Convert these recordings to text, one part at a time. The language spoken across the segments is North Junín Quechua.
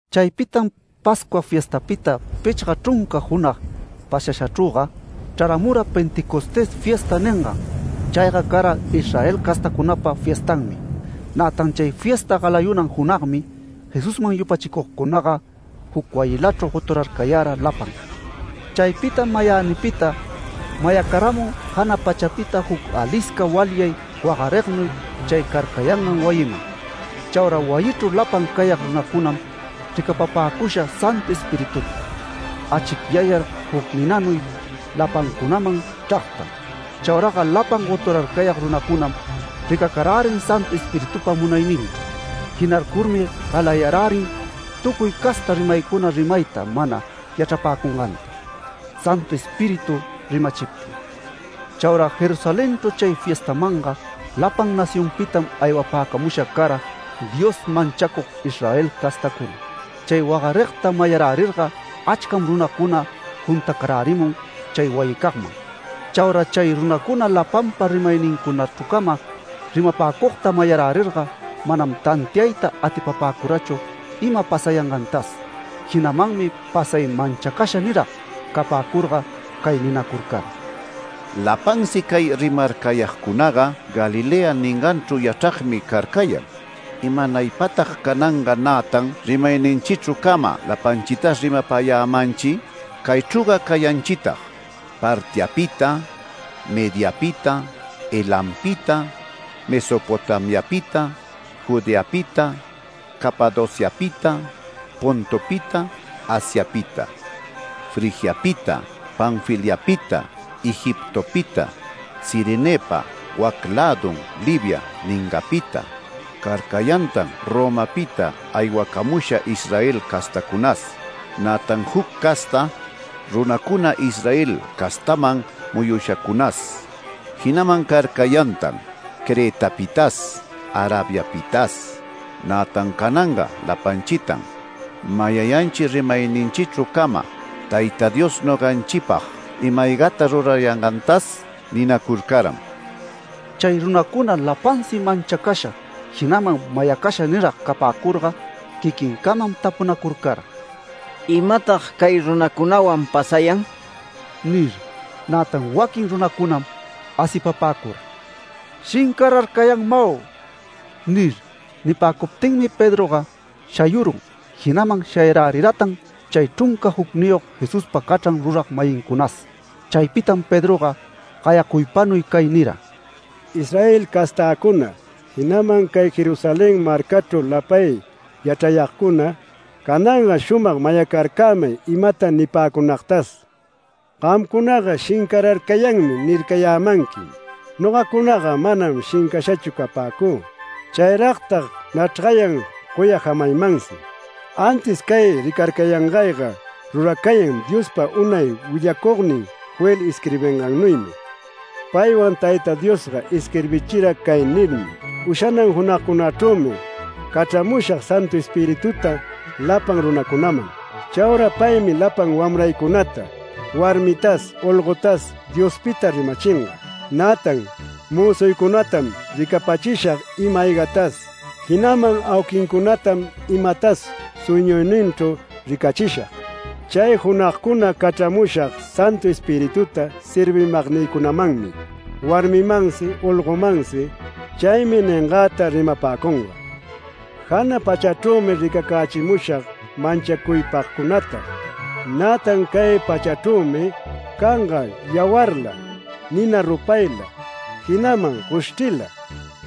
Chaypitam Pascua fiestapita pichga chrunca junag pasashachrüga chraramura ‘Pentecostés fiesta’ ningan. Chayga cara Israel castacunapa fiestanmi. Nätan chay fiesta galayunan junagmi Jesusman yupachicugcunaga juc wayilachru goturarcayara lapan. Chaypitam mayänipita mayacaramun jana pachapita juc alisca walyay wagarignuy chay carcayangan wayiman. Chaura wayichru lapan cayag runacunam ricapapäcusha Santu Espirituta, achicyayar juc ninanuy lapancunaman chragta. Chauraga lapan goturarcayag runacunam ricacarärin Santu Espiritupa munayninchru. Jinarcurmi galayarärin tucuy casta rimaycuna rimayta mana yachrapäcunganta, Santu Espíritu rimachiptin. Chaura Jerusalenchru chay fiestamanga lapan nacionpitam aywapäcamusha cara Dios manchacug Israel castacuna. Chay wagarigta mayarärirga achcam runacuna juntacarärimun chay wayicagman. Chaura chay runacuna lapanpa rimaynincunachru cama rimapäcugta mayarärirga manam tantiayta atipapäcurachu ima pasayangantas. Jinamanmi pasay manchacasha nirag capäcurga cay ninacurcara: “Lapansi cay rimarcayagcunaga Galilea ninganchru yachragmi carcayan. ¿Imanaypatag cananga nätan rimayninchichru cama lapanchitas rimapayämanchi? Caychrüga cayanchitag Partiapita, Mediapita, Elampita, Mesopotamiapita, Judeapita, Capadociapita, Pontopita, Asiapita, Frigiapita, Panfiliapita, Egiptopita, Cirenepa wac lädun Libia ninganpita. Carcayantan Romapita aywacamusha Israel castacunas, nätan juc casta runacuna Israel castaman muyushacunas. Jinaman carcayantan Cretapitas, Arabiapitas. Nätan cananga lapanchitan mayayanchi rimayninchichru cama Tayta Dios noganchipag ima-aygata rurayangantas” ninacurcaram. Chay runacuna lapansi manchacasha, jinaman mayacasha nirag capäcurga quiquincamam tapunacurcara: “¿Imatag cay runacunawan pasayan?” nir. Nätan waquin runacunam asipapäcura “Shincararcayanmau” nir. Nipäcuptinmi Pedroga shayurun jinaman shayaräriratan chay chrunca jucniyog Jesuspa cachran rurag-mayincunas. Chaypitam Pedroga gayacuypanuy cay nira: “Israel castäcuna, jinaman cay Jerusalén marcachru lapay yachrayagcuna, cananga shumag mayacarcämay imata nipäcunagtas: Gamcunaga ‘Shincararcayanmi’ nircayämanquim. Nogacunaga manam shincashachu capäcü. Chayragtag nachrgayan goya jamaymansi. Antis cay ricarcayangayga ruracayan Diospa unay willacugnin Joel isquirbingannuymi. Paywan Tayta Diosga isquirbichira cay nirmi: “Ushanan junagcunachrümi cachramushag Santu Espirituta lapan runacunaman. Chaura paymi lapan wamraycunata, warmitas, olgotas Diospita rimachinga. Nätan mözuycunatam ricapachishag ima-aygatas, jinaman auquincunatam imatas sueñuyninchru ricachishag. Chay junagcuna cachramushag Santu Espirituta servimagnïcunamanmi warmimansi, olgomansi. Chaymi ningäta rimapäcunga. Jana pachachrümi ricacächimushag manchacuypagcunata, nätan cay pachachrümi canga yawarla, nina rupayla, jinaman goshchrila.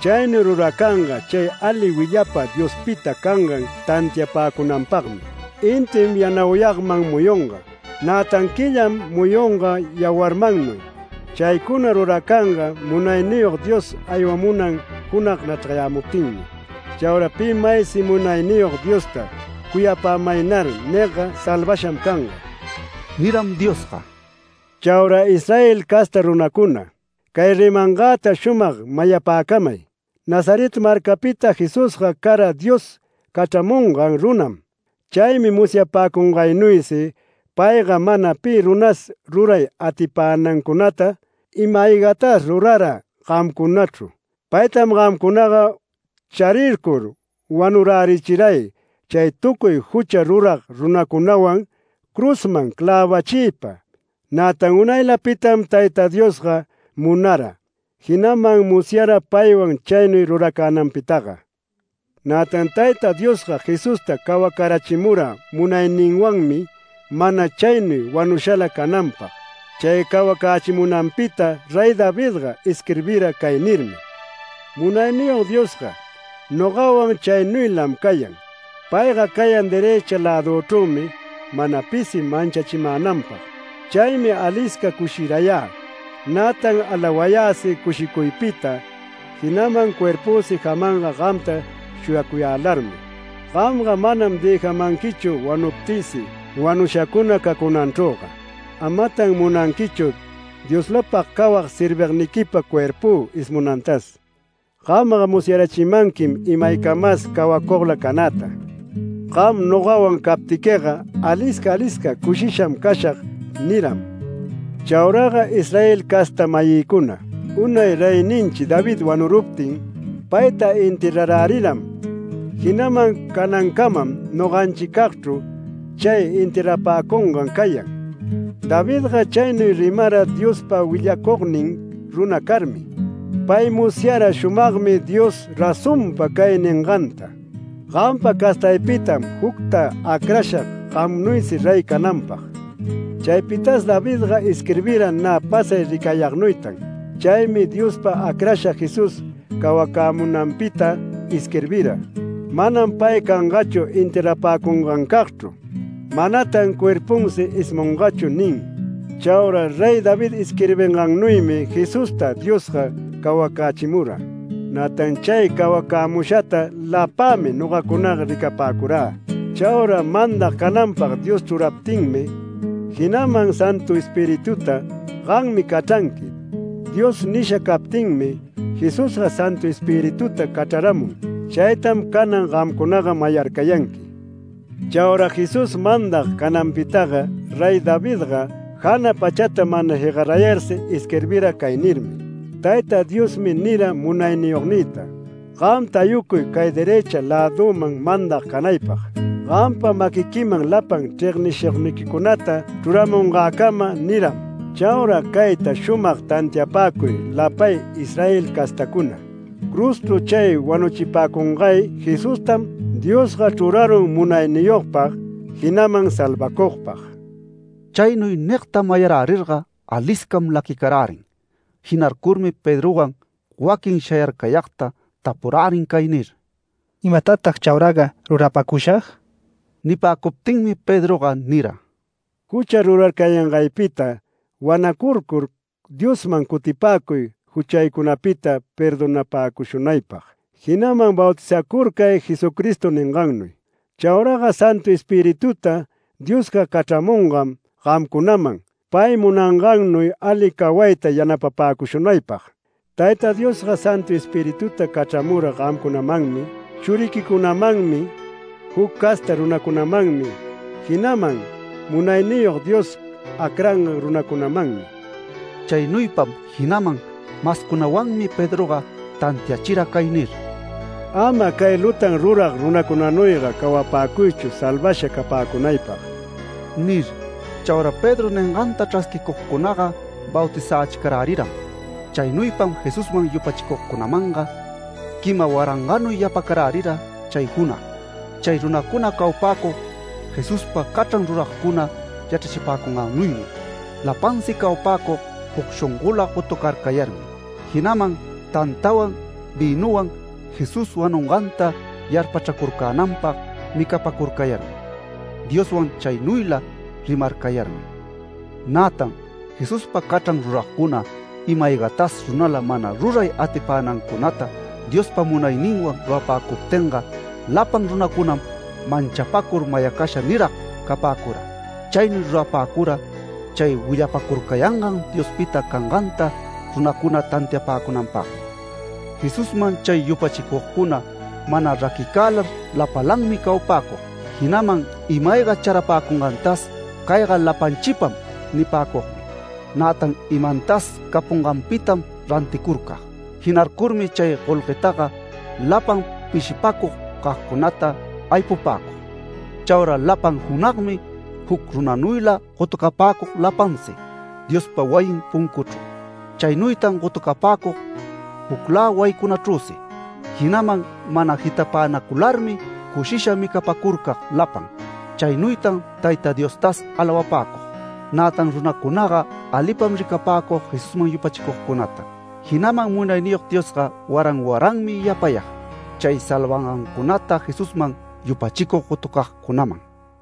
Chaynuy ruracanga chay ali willapa Diospita cangan tantiapäcunanpagmi. Intim yanauyagman muyunga, nätan quillam muyunga yawarmannuy. Chaycuna ruracanga Munayniyog Dios aywamunan junag nachrgarayämuptinmi. Chaura pi maysi Munayniyog Diosta ‘Cuyapämaynar’ nigga salvasham canga” niram Diosga. “Chaura Israel casta runacuna, cay rimangäta shumag mayapäcamay: Nazaret marcapita Jesusga cara Dios cachramungan runam. Chaymi musyapäcungaynuysi payga mana pi runas ruray atipänancunata ima-aygatas rurara gamcunachru. Paytam gamcunaga charircur wanurärichiray chay tucuy jucha rurag runacunawan cruzman clävachiypa. Nätan unaylapitam Tayta Diosga munara, jinaman musyara paywan chaynuy ruracänanpitaga. Nätan Tayta Diosga Jesusta cawacarachimura munayninwanmi mana chaynuy wanushala cananpag. Chay cawacächimunanpita Rey Davidga isquirbira cay nirmi: ‘Munayniyog Diosga, nogawan chaynuylam cayan. Payga cayan derëcha läduchrümi mana pisi manchachimänanpag. Chaymi alisca cushirayä, nätan alawayäsi cushicuypita jinaman cuerpüsi jamanga gamta shuyacuyälarmi. Gamga manam dëjamanquichu wanuptïsi wanushacuna cacunanchrüga. Amatan munanquichu Dioslapag cawag servigniquipa cuerpü ismunantas. Gamga musyarachimanquim imaycamas cawacugla canäta. Gam nogawan captiquiga alisca alisca cushisham cashag’ niram. Chauraga Israel casta-mayïcuna, unay Reyninchi David wanuruptin, payta enterraräriram, jinaman canancamam noganchicagchru chay enterrapäcungan cayan. Davidga chaynuy rimara Diospa willacugnin runa carmi. Pay musyara shumagmi Dios razonpa cay ninganta: ‘Gampa castaypitam jucta acrashag gamnuysi rey cananpag’. Chaypitas Davidga isquirbira nä pasay ricayagnuytan. Chaymi Diospa acrashan Jesús cawacämunanpita isquirbira: ‘Manam pay cangachu enterrapäcungancagchru, manatan cuerpunsi ismungachu’ nin. Chaura Rey David isquirbingannuymi Jesusta Diosga cawacächimura. Nätan chay cawacämushata lapämi nogacunaga ricapäcurä. Chaura mandag cananpag Dios chruraptinmi, jinaman Santu Espirituta ‘Gammi cachranqui’ Dios nisha captinmi, Jesusga Santu Espirituta cachraramun. Chaytam canan gamcunaga mayarcayanqui. Chaura Jesús mandag cananpitaga Rey Davidga jana pachata mana jegarayarsi isquirbira cay nirmi: ‘Tayta Diosmi nira Munayniyognïta: “Gam tayucuy cay derëcha läduman mandag canaypag. Gampa maquiquiman lapan chregnishugniquicunata chruramungäcama” niram’. Chaura cayta shumag tantiapäcuy lapay Israel castacuna: Cruzchru chay wanuchipäcungay Jesustam. Diosga chrurarun munayniyogpag jinaman salvacugpag”. Chaynuy nigta mayarärirga aliscam laquicarärin. Jinarcurmi Pedrowan waquin shayarcayagta tapurärin cay nir: “¿Imatatag chauraga rurapäcushag?” Nipäcuptinmi Pedroga nira: “Jucha rurarcayangaypita wanacurcur, Diosman cutipäcuy juchaycunapita perdonapäcushunaypag, jinaman bautizacurcay Jesucristo ningannuy. Chauraga Santu Espirituta Dios cachramungam gamcunaman pay munangannuy ali cawayta yanapapäcushunaypag. Tayta Diosga Santu Espirituta cachramura gamcunamanmi, churiquicunamanmi, juc casta runacunamanmi, jinaman Munayniyog Dios acrangan runacunamanmi”. Chaynuypam jinaman mascunawanmi Pedroga tantiachira cay nir: “Ama cay lutan rurag runacunanuyga cawapäcuychu salvasha capäcunaypag” nir. Chaura Pedro ninganta chrasquicugcunaga bautizächicaräriram. Chaynuypam Jesusman yupachicugcunamanga quima warangannuy yapacarärira chay junag. Chay runacuna cawapäcug Jesuspa cachran ruragcuna yachrachipäcungannuymi. Lapansi cawapäcug juc shongola gotucarcayarmi, jinaman tantawan vïnuwan Jesús wanunganta yarpachracurcänanpag micapacurcayarmi, Dioswan chaynuyla rimarcayarmi. Nätan Jesuspa cachran ruragcuna ima-aygatas runala mana ruray atipänancunata Diospa munayninwan rurapäcuptinga lapan runacunam manchapacur mayacasha nirag capäcura. Chaynuy rurapäcura chay willapacurcayangan Diospita canganta runacuna tantiapäcunanpagmi. Jesusman chay yupachicugcuna mana raquicälar lapalanmi cawapäcug, jinaman ima-ayga charapäcungantas “Cayga lapanchipam” nipäcugmi. Nätan imantas capunganpitam ranticurcag. Jinarcurmi chay golguetaga lapan pishipacug cagcunata aypupäcug. Chaura lapan junagmi juc runanuyla gotucapäcug lapansi Diospa wayin puncuchru. Chaynuytan gotucapäcug juclä wayicunachrüsi, jinaman mana jitapänacularmi cushisha micapäcurcag lapan. Chaynuytan Tayta Diostas alawapäcug, nätan runacunaga alipam ricapäcug Jesusman yupachicugcunata, jinaman Munayniyog Diosga waran waranmi yapayag chay salvangancunata Jesusman yupachicug gotucagcunaman.